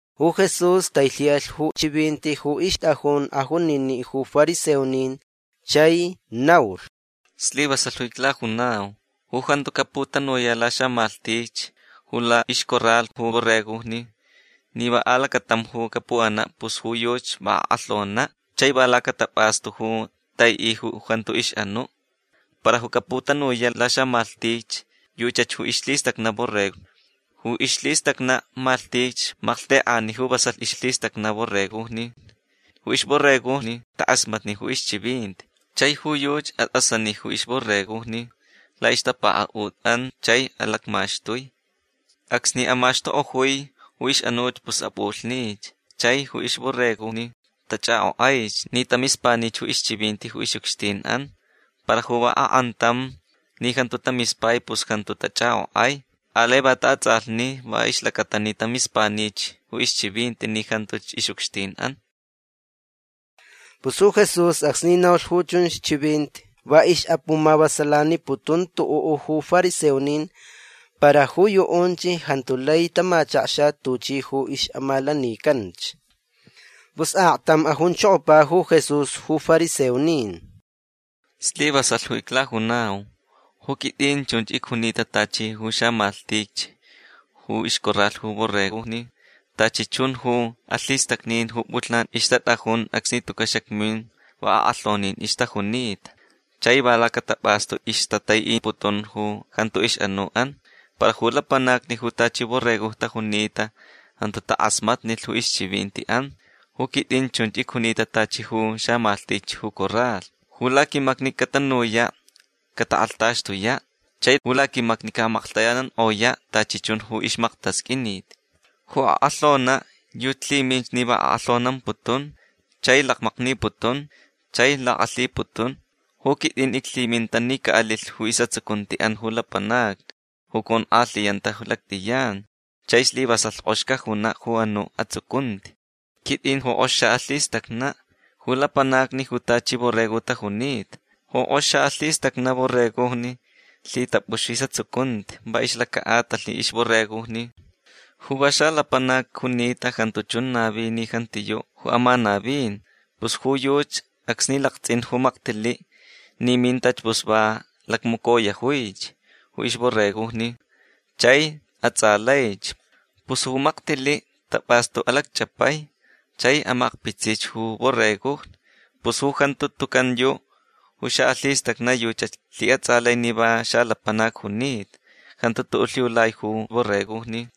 Ju Jesús tailhi'alh ju chivinti ju ixt'ajun ajunini' ju fariseonin chai naulh: ―Slivasalh ju iclajunau. Ju jantu caputanuya' laxamalhtich ju la'ixcorral ju borregojni ni va alacatam ju capu'ana' pus ju yuchi va ak'alhona' chai va lacatap'astu ju tai'i ju jantu ix'anu'. Para ju caputanuya' laxamalhtich yuchach ju ixlhistacna' borregojni. Ju ixlhistacna' malhtich malhtek'ani ju vasalh ixlhitacna' borregojni. Ju ixborregojni tak'asmatni ju ixchivinti. Chai ju yuchi at'asani ju ixborregojni la'ixtapaka'ut'an chai alacmaxtui. Acsni amaxtuk'ojui ju ix'anuch pus ap'ulhnich. Chai ju ixborregojni tach'ak'ok'aich ni tamispanich ju ixchivinti ju ix'ucxtin'an. Para ju va ak'antam ni jantu tamispai pus jantu tach'ak'ok'ai. Alai va ta'ats'alhni va ixlacata ni tamispanich ju ixchivinti ni jantuch ix'ucxtin'an. Pus ju Jesús acsni naulh ju chunch chivinti va ix'apumavasalaniputun tu'u' ju fariseonin. Para ju yu'unch jantu lai tamachakxa tuchi ju ix'amalanicanch. Pus aktam ajunchokopa ju Jesús ju fariseonin: ―Slivasalh ju iclajunau. Ju quit'in chunch icjunita tachi ju xamalhtich ju ixcorral ju borregojni. Tachi chun ju alhistacnin ju p'ulhnan ixtat'ajun acsni tuca' xacmin va ak'alhonin ixtajunita. Chai va lacatap'astu ixtatai'iputun ju jantu ix'anu'an. Para ju lapanacni ju tachi borregojni tajunita jantu tak'asmatnilh ju ixchivinti'an. Ju quit'in chunch icjunita tachi ju xamalhtich ju corral. Ju laquimacni catanuya' catak'alhtaxtuya'. Chai ju laquimacni ca'amaklhtayanank'oya' tachi chun ju ixmaktasq'uinit. Ju ak'alhona' yuchi lhiminch ni va ak'alhonamputun chai lakmakniputun chai lak'alhiputun. Ju quit'in iclhiminta ni ca'alilh ju is'atsucunti'an ju lapanacni ju conk'alhiyanta lact'iyan. Chai slivasalh k'ox cajuna' ju anu' atsucunti. Quit'in ju k'ox xa'alhistacna' ju lapanacni ju tachi borregojni tajunita. Ju k'ox xa'alhistacna' borregojni lhitap'ux ju is'atsucunti va ixlaca'atalh ixborregojni. Ju va xalapanac junita jantu chun navi ni jantiyu' ju amanavin. Pus ju yuchi acsni lakts'in ju maktili' ni mintach pus va lacmacoyojuich ju borregojni. Chai ats'alaich. Pus ju maktili' tap'astu alacch'apai chai amakpitsich ju borregojni. Pus ju jantu tucan yu' ju xa'alhistacna' yuchach lhi'ats'alai ni va xalapanac junita. Jantu tu'u' lhiulai ju borregojni.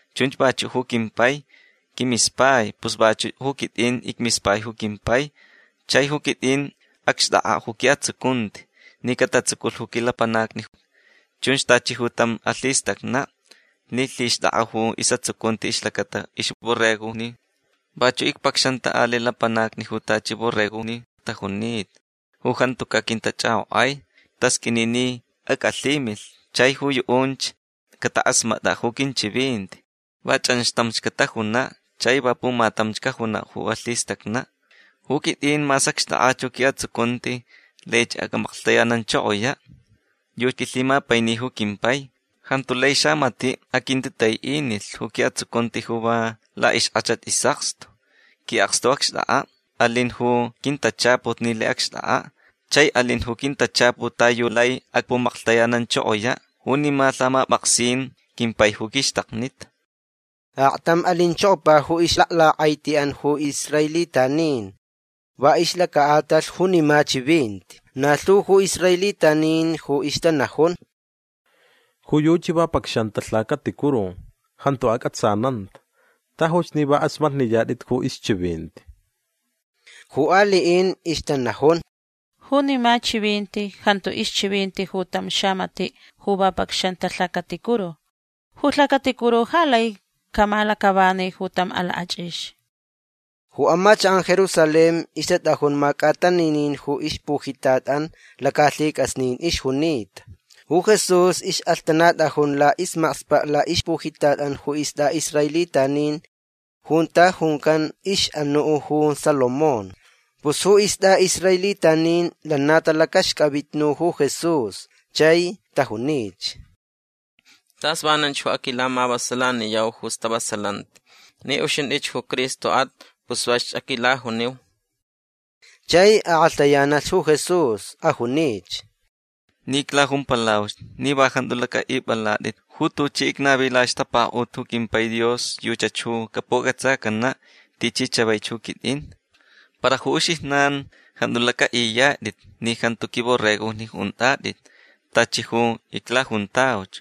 Chunch vachu' ju quimpai quimispai. Pus vachu' ju quit'in icmispai ju quimpai. Chai ju quit'in acxt'ak'a' ju qui'atsucunti ni catatsuculh ju quilapanacni. Chun tachi tam alhistacna' ni lhixt'ak'a ju is'atsucunti ixlacata ixborregojni. Vachu' icpacxanta ali' lapanacni ju tachi borregojni tajunita ju jantuca' quintach'ak'ok'ai. Tasq'uini ni ac'alhimilh. Chai ju yu'unch catak'asmat'a' ju quinchivinti. Va ch'anxtamch catajuna'. Chai va pumatamch cajuna' ju alhistacna'. Ju quit'in mas acxt'ak'ach ju qui'atsucunti laich ac'amaklhtayananchokoya'. Yuchi quilhimapaini ju quimpai. Jantu lai xamati' aquintitai'inilh ju qui'atsucunti ju va la'ixk'achat is'akstu. Qui'akstu ju acxt'ak'a'. Alin ju quintachaput ni lai acxt'ak'a'. Chai alin ju quintachaput ta yu lai acpu'amaklhtayananchokoya'. Junima lhamap'aksin quimpai ju quixtaknita. Aktam alinchokopa ju ixlaklak'aiti'an ju israelitanin va ixlaca'atalh junima chivinti. Na lhu ju israelitanin ju ixtanajun: ―Ju yuchi va pacxanta lhacaticuru. Jantu ac'atsananta. Tajuch ni k'asmatniyat'it ju ixchivinti. Ju ali'in ixtanajun: ―Junima chivinti jantu ixchivinti ju tam xamati' ju va pacxanta lhacaticuru. Ju lhacaticuru ja lai camalac'avani ju tam alak'ach'ix. Ju amachak'an Jerusalén ixtat'ajun mac'ataninin ju ixpujitat'an. Lacalhic'asnin ixjunita. Ju Jesús ix'alhtanat'ajun la'ismakspa' la'ixpujitat'an ju ist'a'israelitanin junta juncan ix'anu' ju Salomón. Pus ju ist'a'israelitanin lana talacaxc'avitnu ju Jesús. Chai tajunich: ―Tas vananch ju aquilamavasalaniyau ju stavasalanti. Ni uxint'ich ju Cristo'at pus vasch aquilajuniu. Chai ak'alhtayanalh ju Jesús. Ajunich: ―Ni iclajumpalauch. Ni va jantu lac'a'ip'alat'it. Ju tuchi icnavi la'ixtapaka'ut ju quimpai Dios yuchach ju capuc'atsacana' tichi chavaich ju quit'in. Para ju uxijnan jantu lac'a'iyat'it ni jantu quimborregojni unt'at'it tachi ju iclajuntauch.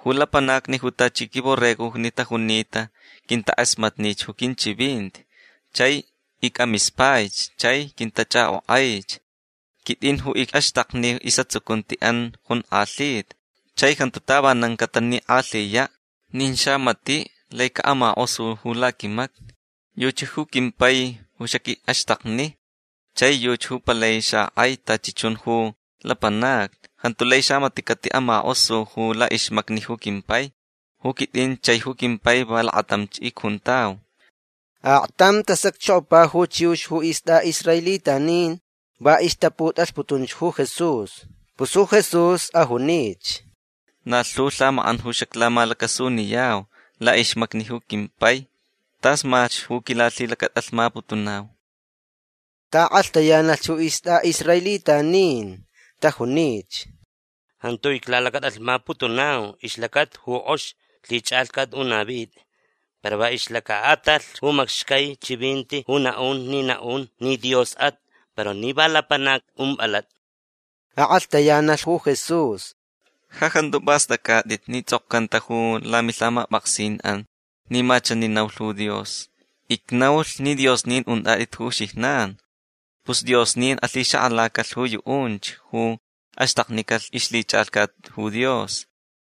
Ju lapanacni ju tachi quimborregojni tajunita quintak'asmatnich ju quinchivinti. Chai ic'amispaich. Chai quintach'ak'ok'aich. Quit'in ju ic'axtakni ju is'atsucunti'an jonk'alhita. Chai jantu tavanan catanik'alhiya'. Nin xamati' lai ca'amak'osu ju laquimacni. Yuchi ju quimpai ju xaqui'axtakni. Chai yuchi ju palai xak'ai tachi chun ju lapanacni. Jantu lai xamati' cati'amak'osu ju la'ixmacni ju quimpai. Ju quit'in chai ju quimpai va lakatamch icjuntau. Aktam tasacchokopa ju chiux ju ist'a'israelitanin. Va ixtaput'alhputunch ju Jesús. Pus ju Jesús ajunich: ―Na lhu lhamak'an ju xaclamalacasuniyau la'ixmacni ju quimpai. Tasmalhch ju quilalhilacat'alhmaputunau. Ta'ak'alhtayanalh ju ist'a'israelitanin. Tajunich: ―Jantu iclalacat'alhmaputunau ixlacata ju k'oxi lhich'alhcat ju navit'a. Para va ixlaca'atalh ju macxcai chivinti ju na'un ni na'un ni Dios'at. Para ni va lapanac ump'alat'a. Ak'alhtayanalh ju Jesús: ―Ja jantu p'ast'ac'at'it ni ts'okcanta ju lamilhamap'aksin'an ni ma chani naulh ju Dios: “Icnaulh ni diosnin unt'at'it ju uxijnan”. Pus diosnin alhixak'alacalh ju yu'unch ju axtaknicalh ixlhich'alhcat ju Dios.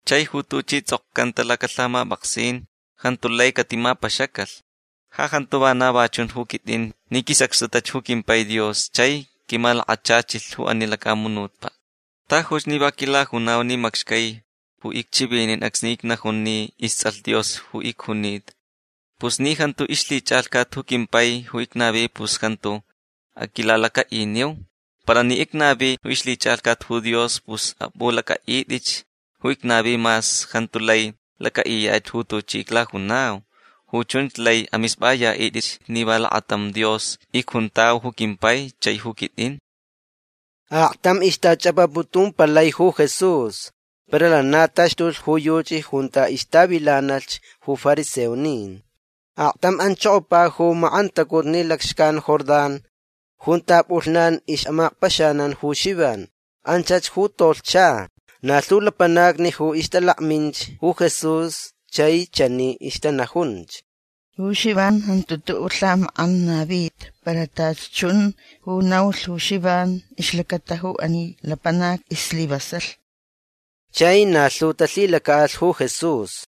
Chai ju tuchi ts'okcanta lacalhamap'aksin jantu lai catimapaxacalh. Ja jantu vana va chun ju quit'in ni quisacxtutach ju quimpai Dios chai quimalakachachilh ju ani lacamunutpa'. Tajuch ni va quilajunau ni macxcai ju icchivinin acsni icnajun ni ists'alh Dios ju icjunita. Pus ni jantu ixlhich'alhcat ju quimpai ju icnavi pus jantu aquilalaca'iniu. Para ni icnavi ju ixlhich'alhcat ju Dios pus ap'ulac'a'it'itch ju icnavi mas jantu lai lac'a'iyat'it ju tuchi iclajunau. Ju chunch lai amisp'aya'it'itch ni va lakatam Dios icjuntau ju quimpai chai ju quit'in. Aktam ixtach'apaputumpalai ju Jesús. Para lana taxtulh ju yuchi junta ixtavilanalhch ju fariseonin. Aktam anchokopa ju mak'antacutni lacxcan Jordán junta p'ulhnan ix'amakpaxanan ju Xivan. Anchach ju tolhcha. Na lhu lapanacni ju ixtalakminch ju Jesús chai chani ixtanajunch: ―Ju Xivan jantu tu'u' lhamak'an navita. Para tachi chun ju naulh ju Xivan ixlacata ju ani lapanac islivasalh. Chai na lhu talhilaca'alh ju Jesús.